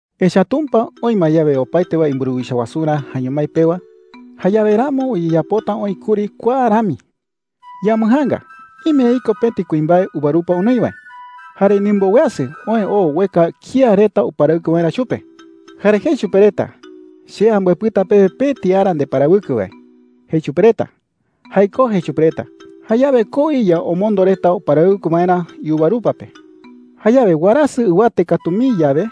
“Echa’ä Tumpa oï ma yawe opaete wae imburuwicha wasurä jaeño mái pewa, jayawe ramo uyeyapota oï kuri kua rami: Yambɨjaanga. Ime iko pëti kuimbae uvarupa onoi wae,” jei. “Jare ndimboweasɨ oë oo ueka kía reta uparawɨkɨ waerä chupe. Jare jei chupe reta: ‘Che ambɨepɨta pewe pëti ara ndeparawɨkɨ wae,’ jei chupe reta. ‘Jaikó,’ jei chupe reta. Jayawe koo iya omondo reta uparawɨkɨ waerä iuvarupa pe,” jei. “Jayawe warasɨ ɨwate katu mii yawe,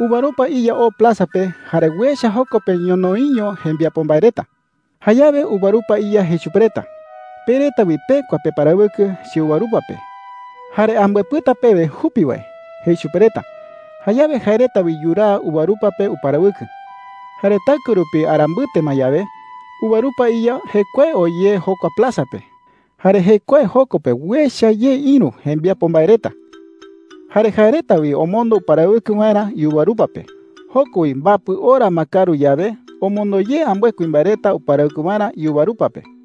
uvarupa iya oo plaza pe jare uecha joko pe ñonoïiño jembiapo mbae reta. Jayawe uvarupa iya jei chupe reta: ‘Pe reta wi pekua peparawɨkɨ cheuvarupa pe. Jare ambɨepɨta pewe jupi wae,’ jei chupe reta. Jayawe jae reta wi yuraa uvarupa pe uparawɨkɨ,” jei. “Jare taɨkue rupi ara mbɨte ma yawe, uvarupa iya jekuae oo ye jokua plaza pe, jare jekuae joko pe uecha ye ïru jembiapo mbae reta. Jare jae reta wi omondo uparawɨkɨ waerä iuvarupa pe. Joko wi mbapɨ ora ma kaaru yawe, omondo ye ambɨe kuimbae reta uparawɨkɨ waerä iuvarupa pe,” jei.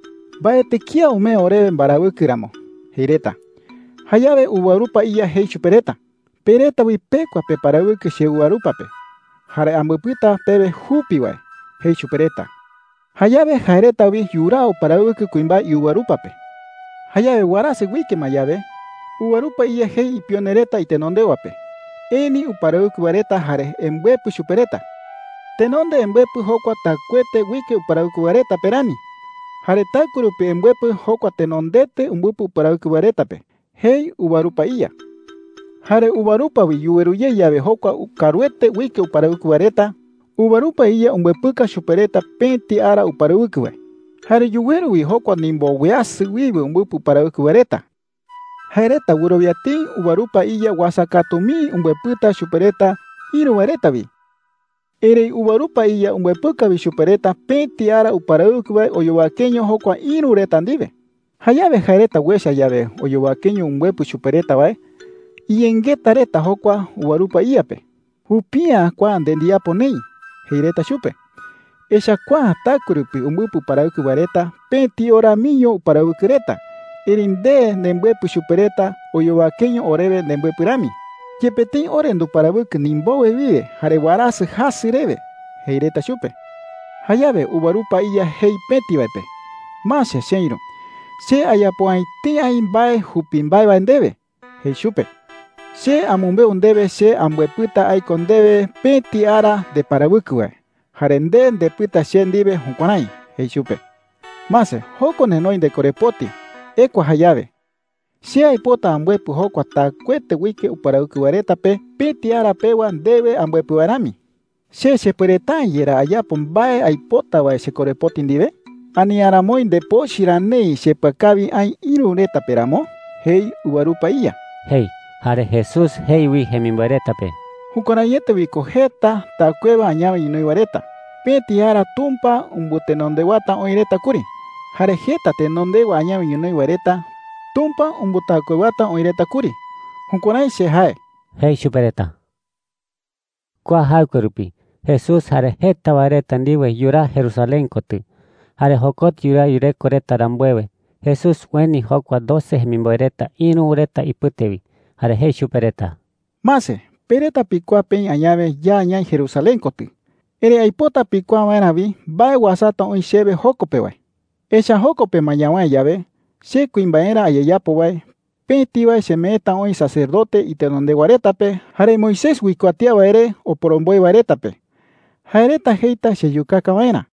‘Mbaetɨ kía umee orewe mbarawɨkɨ ramo,’ jei reta. “Jayawe uvarupa iya jei chupe reta: ‘Pe reta wi pekua peparawɨkɨ cheuvarupa pe. Jare ambɨepɨta pewe jupi wae,’ jei chupe reta. Jayawe jae reta wi yuraa uparawɨkɨ kuimbae iuvarupa pe,” jei Jesús. “Jayawe warasɨ uike ma yawe, uvarupa iya jei ipione reta itenondewa pe: ‘Eni uparawɨkɨ wae reta jare embɨepɨ chupe reta. Tenonde embɨepɨ jokua taɨkuete uike uparawɨkɨ wae reta pe rani. Jare taɨkue rupi embɨepɨ jokua tenondete umbɨpɨ uparawɨkɨ wae reta pe,’ jei uvarupa iya,” jei. “Jare uvarupa wi yuweru ye yawe jokua kaaruete uike uparawɨkɨ wae reta, uvarupa iya umbɨepɨka chupe reta pëti ara uparawɨkɨ wae,” jei. “Jare yuweru wi jokua ndimboweasɨ wiwe umbɨpɨ uparawɨkɨ wae reta. Jae reta wɨrowia tëi uvarupa iya uasa katu mii umbɨepɨta chupe reta ïru wae reta wi. Erëi uvarupa iya umbɨepɨka wi chupe reta pëti ara uparawɨkɨ wae oyowakeño jokua ïru reta ndiwe,” jei. “Jayawe jae reta uecha yawe oyowakeño umbɨepɨ chupe reta wae, iyengeta reta jokua uvarupa iya pe. ‘Jupi’ä kua nde ndiyapo neï,’ jei reta chupe. ‘Echa’ä kua taɨkue rupi umbɨpɨ uparawɨkɨ wae reta pëti ora miño uparawɨkɨ reta. Erëi nde nembɨepɨ chupe reta oyowakeño orewe nembɨepɨ rami, yepe tëi ore nduparawɨkɨ ndimbowe wiwe jare warasɨ jasɨ rewe,’ jei reta chupe,” jei. “Jayawe uvarupa iya jei pëti wae pe: ‘Mase cheïru, che ayapo’ä etei aï mbae jupi mbae wae ndewe,’ jei chupe. ‘Che amɨmbeu ndewe che ambɨepɨta aiko ndewe pëti ara ndeparawɨkɨ wae. Jare nde ndepɨta che ndiwe jukuärái,’ jei chupe. ‘Mase, joko nenoi ndekorepoti. Ekua jayawe. Che aipota ambɨepɨ jokua taɨkuete uike uparawɨkɨ wae reta pe pëti ara pewa ndewe ambɨepɨ wae rami. ¿Che chepuereta’ä yerá ayapo mbae aipota wae chekorepoti ndiwe? Ani ¿aramoi ndepochɨ ra neï chepɨakawi aï ïru reta pe ramo?’ jei uvarupa iya,” jei. Jare Jesús jei wi jemimboe reta pe: “Jukuäraiete wi ko jeta taɨkuewa añawe ñonoï wae reta, pëti ara Tumpa umbɨtenondewata oï reta kuri. Jare jeta tenondewa añawe ñonoï wae reta, Tumpa umbɨtaɨkuewata oï reta kuri. Jukuärái che jae,” jei chupe reta. Kua jaɨkue rupi Jesús jare jeta wae reta ndiwe yuraa Jerusalén kotɨ. Jare jokotɨ yuraa yureko reta rambuewe, Jesús ueni jokua doce jemimboe reta ïru reta ipɨte wi, jare jei chupe reta: “Mase, pe reta pikuaa peï añawe ya ñaï Jerusalén kotɨ. Erëi aipota pikuaa waerä wi mbae uasata oï chewe joko pe wae,” jei chupe reta. “Echa’ä joko pe ma ñawäe yawe, che kuimbaerä ayeyapo wae, pëti wae chemeeta oï sacerdote itenondewa reta pe jare Moisés uikuatía wae re oporomboe wae reta pe. Jae reta jeita cheyukaka waerä,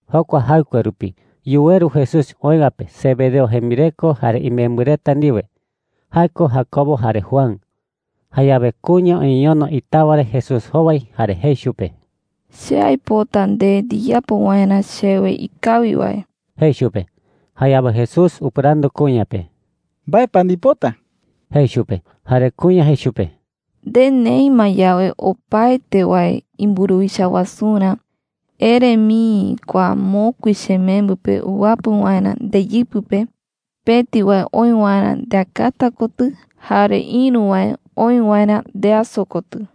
Jokua jaɨkue rupi yuweru Jesús oï wae pe Zebedeo jembireko jare imembɨ reta ndiwe – jae ko Jacobo jare Juan. Jayawe kuña uñeñono itawa re Jesús jowai jare jei chupe: “Che aipota nde ndiyapo waerä chewe ikawi wae,” jei chupe. Jayawe Jesús upɨrandu kuña pe: “¿Mbae pa ndipota?” jei chupe. Jare kuña jei chupe: “Nde neï ma yawe opaete wae imburuwicha wasurä, ere mii kua mokui chemembɨ pe uwapɨ waerä ndeyɨpɨ pe, pëti wae oï waerä ndeakata kotɨ jare ïru wae oï waerä ndeaso kotɨ.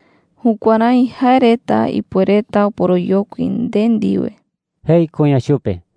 Jukuärái jae reta ipuereta oporoyokui nde ndiwe,” jei kuña chupe.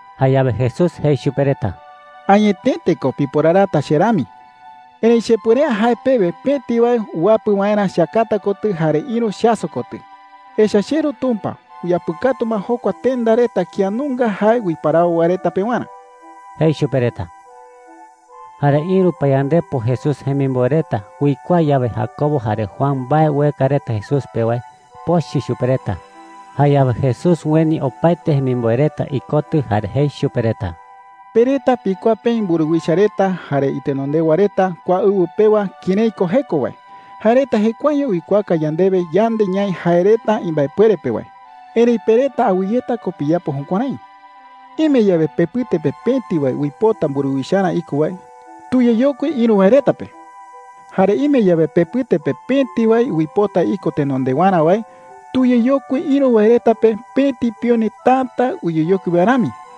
Jayawe Jesús jei chupe reta: “Añetete ko piporarata che rami,” jei. “Erëi chepuere’ä jae pewe pëti wae uwapɨ waerä cheakata kotɨ jare ïru cheaso kotɨ. Echa’ä cheRu Tumpa uyapɨkatu ma jokua tenda reta kía nunga jae uiparawo wae reta pewarä,” jei chupe reta. Jare ïru payandepo Jesús jemimboe reta uikuaa yawe Jacobo jare Juan mbae ueka reta Jesús pe wae, pochɨ chupe reta. Jayawe Jesús ueni opaete jemimboe reta ikotɨ jare jei chupe reta: “Pe reta pikuaa peï mburuwicha reta jare itenondewa reta kua ɨwɨ pewa kërái ko jeko wae. Jae reta jekuaeño uikuaaka yandewe yande ñaï jae reta imbaepuere pe wae,” jei chupe reta. “Erëi pe reta awɨyeta ko piyapo jukuärái,” jei. “Ime yawe pepɨte pe pëti wae uipota mburuwicharä iko wae, tuyeyokui ïru wae reta pe,” jei. “Jare ime yawe pepɨte pe pëti wae uipota iko tenondewarä wae, tuyeyokui ïru wae reta pe pëti pione täta uyeyokui wae rami,” jei.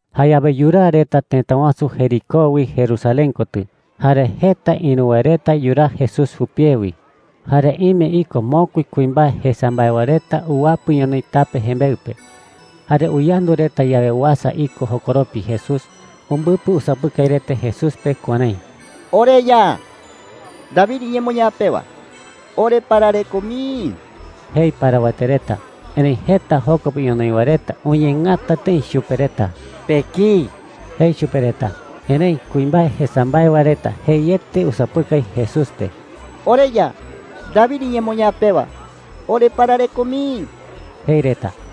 Jayawe yuraa reta tëta wasu Jericó wi Jerusalén kotɨ, jare jeta ïru wae reta yuraa Jesús jupie wi. Jare ime iko mokui kuimbae jesa mbae wae reta uwapɨ ñonoï tape jembeɨ pe. Jare uyandu reta yawe uasa iko jokoropi Jesús, umbɨpɨ usapɨkai reta Jesús pe kuärái: “OreYa, David iñemoñaa pewa, oreparareko mii,” jei parawete reta. Erëi jeta joko pe ñonoï wae reta uñeengata tëi chupe reta. “Pekïi,” jei chupe reta. Erëi kuimbae jesa mbae wae reta jeiete usapɨkai Jesús pe: “OreYa, David iñemoñaa pewa, oreparareko mii,” jei reta.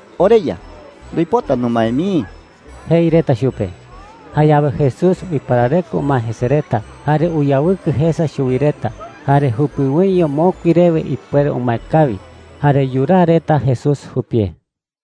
“OreYa, nduipota numae mii,” jei reta chupe. Jayawe Jesús uiparareko umae jese reta, jare uyawɨkɨ jesa chuwi reta. Jare jupiwoiño mokui rewe ipuere umae kawi, jare yuraa reta Jesús jupie.